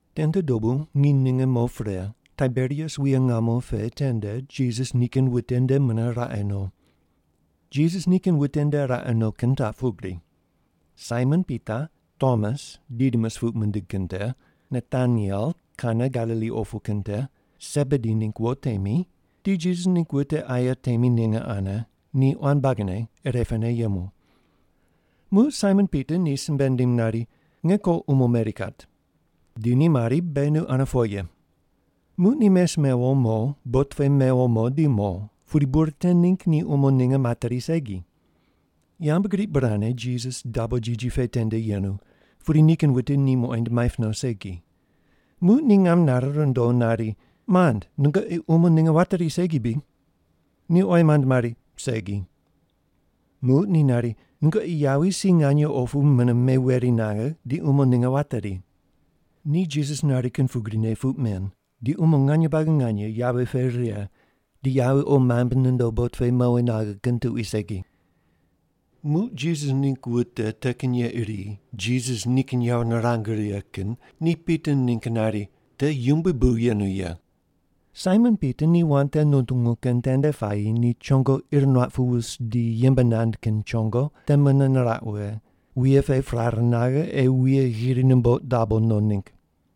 Tende dobu nginy ninge mo pre Taiberias wuye ngamo pe tende Jisas nikin wute nde mune raqe no. Jisas nikin wute nde raqe no kin taq pugri. Saimon Pita, Tomas (Didimus puq mindig kin te), Nataniel Kana Galili opu kin te, Sebedi ningg wo temi, di Jisas ningg wute aye temi ninge ane ni quan buagine irepene yemu. Muq Saimon Pita ni simbe nindim nari, “Nge ko umo meri kat.” Di ni mari, “Beghi nu ane po ye.” Muq ni mes mewo mo, bot pe mewo mo di mo, pudi bur te ningg ni umo ninge materi segi. Yambgriq burane Jisas dabo jiji pe tende yenu, pudi nikin wute ni muqoind maip no segi. Muq ni ngam nare rundo nari, “Mand, nungoqi umo ninge wateri segi bri?” Ni oyi mand mari, “Segi.” Muq ni nari, “Nungoqi yawi si nganye opu mune meweri naghe, di umo ninge wateri.” Ni Jisas nari kin pugrine puq men di umo nganye buagi nganye yawi pe righe, di yawi qo maimb nondo bot pe mowi naghe kin tuqui segi. Muq Jisas ningg wute te kin ye iri Jisas nikin yawo nirang righe kin ni Pita ningg nari, “Te Yumbui bu yenu ye.” Saimon Pita ni wand te nutungu kin tende puayi ni chongo ir nuaq pu wus di yembe nand kin chongo te mune niraq wughe, wuye pe prare naghe ei wuye ghiri numboq dabo no ningg.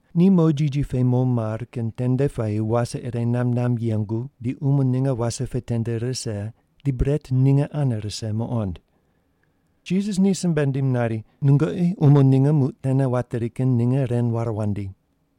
Ni mo jiji pe mo mar kin tende puayi wase ire namb namb yengu di umo ninge wase pe tende rise, di bret ninge ane rise muqond. Jisas ni simbe nindim nari, “Nungoqi umo ninge muq tene wateri kin ninge ren ware wandi.”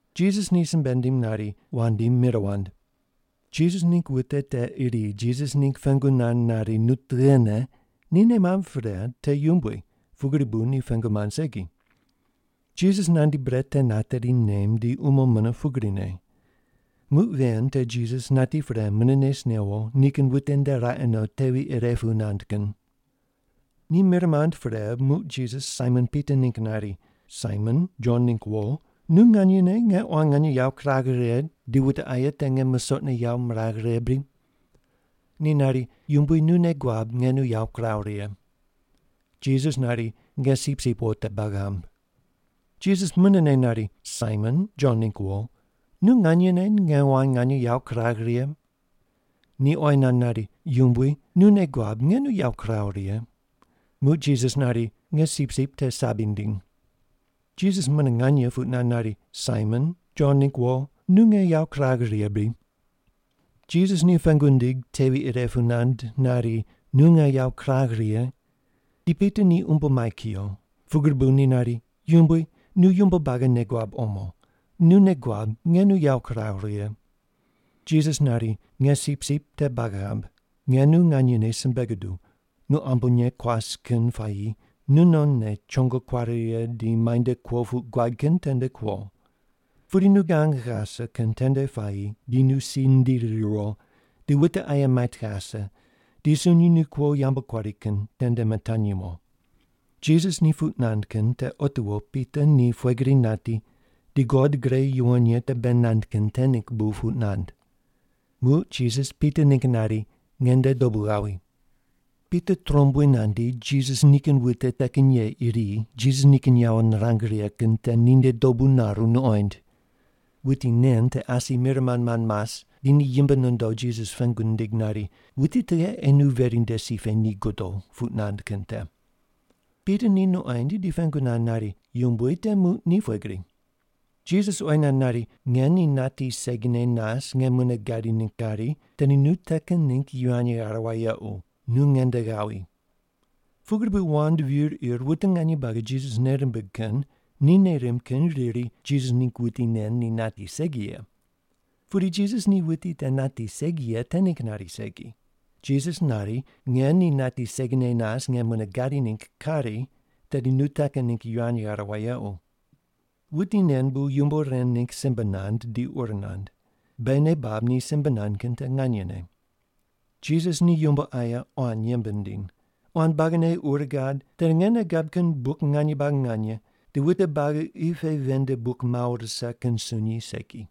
Jisas ni simbe nindim nari, “Wandi, mir wand.” Jisas ningg wute te iri Jisas ningg pengu nand nari, “Nu tughene” ni nei mamb pre te Yumbui, pugri bu ni pengu mand segi. Jisas nandi bret te nateri nem di umo mune pugrine. Muq ven te Jisas nati pre mune nes newo nikin wute nde raqe no tevi ire pu nand kin. Ni mir mand pre, muq Jisas Saimon Pita ningg nari, “Saimon, Jon ningg wo, nu nganyene nge quan nganye yawo kuragh righe, di wute aye te nge musoqne yawo miragh righe bri?” Ni nari, “Yumbui, nu nei guab nge nu yawo kiraw righe.” Jisas nari, “Nge sipsip wo te bag ghamb.” Jisas munene nari, “Saimon, Jon ningg wo, nu nganyene nge quan nganye yawo kuragh righe?” Ni oyi nand nari, “Yumbui, nu nei guab nge nu yawo kiraw righe.” Muq Jisas nari, “Nge sipsip te sabi ndiny.” Jisas mune nganye puq nand nari, “Saimon, Jon ningg wo, nu nge yawo kuragh righe bri?” Jisas ni pengu nindig tevi ire pu nand nari, “Nu nge yawo kuragh righe?” Di Pita ni umbo mai kuyo. Pugri bu ni nari, “Yumbui, nu yumbo buagi nei guab omo. Nu nei guab nge nu yawo kiraw righe.” Jisas nari, “Nge sipsip te bag ghamb. Nge nu nganyene simbe guduw, nu ambonye kuas kin puayi nunonne chongo kuare righe di muainde kuo puq guad kin tende kuo. Pudi nu gang ghase kin tende puayi di nu si ndiri riwo, di wute aye mait ghase, di sunyi nu kuo yambu kuari kin tende mitanyi mo.” Jisas ni puq nand kin te otiwo Pita ni pughe gri nati di God gre yuwon ye te bei nand kin te ningg bu puq nand. Muq Jisas Pita ningg nari, “Nge nde dobu ghawi.” Pita trombui nandi, Jisas nikin wute te kin ye iri Jisas nikin yawo nirang righe kin te ninde dobu naru nuqoind. (Wuti nen te asi mir mand mand mas di ni yimb nondo Jisas pengu nindig nari, “Wuti tughe ei nu veri nde si pe ni godo,” puq nand kin te.) Pita ni nuqoind di pengu nand nari, “Yumbui, te muq ni pughe gri?” Jisas oyi nand nari, “Nge ni nati segine nas nge mune gadi ningg kari, tedi nu te kin ningg yivany ghare wayequ. Nu ngende ghawi.” Pugri bu wand vir ir wute nganye buagi Jisas nei rimbig kin ni nei rimb kin riri Jisas ningg wuti nen ni nati segi ye. Pudi Jisas ni wuti te nati segi ye te ningg nari segi. Jisas nari, “Nge ni nati segine nas nge mune gadi ningg kari, tedi nu te kin ningg yivany ghare wayequ.” Wuti nen bu yumbo ren ningg simbe nand, di ur nand. Beghi nei bab ni simbe nand kin te nganyene. Jisas ni yumbo aye quan yembe nindiny. Quan buagine ur gad, tedi nge nei gab kin buk nganye buagi nganye, di wute buagi qi pe ven nde buk mawo rise kin sunyi segi.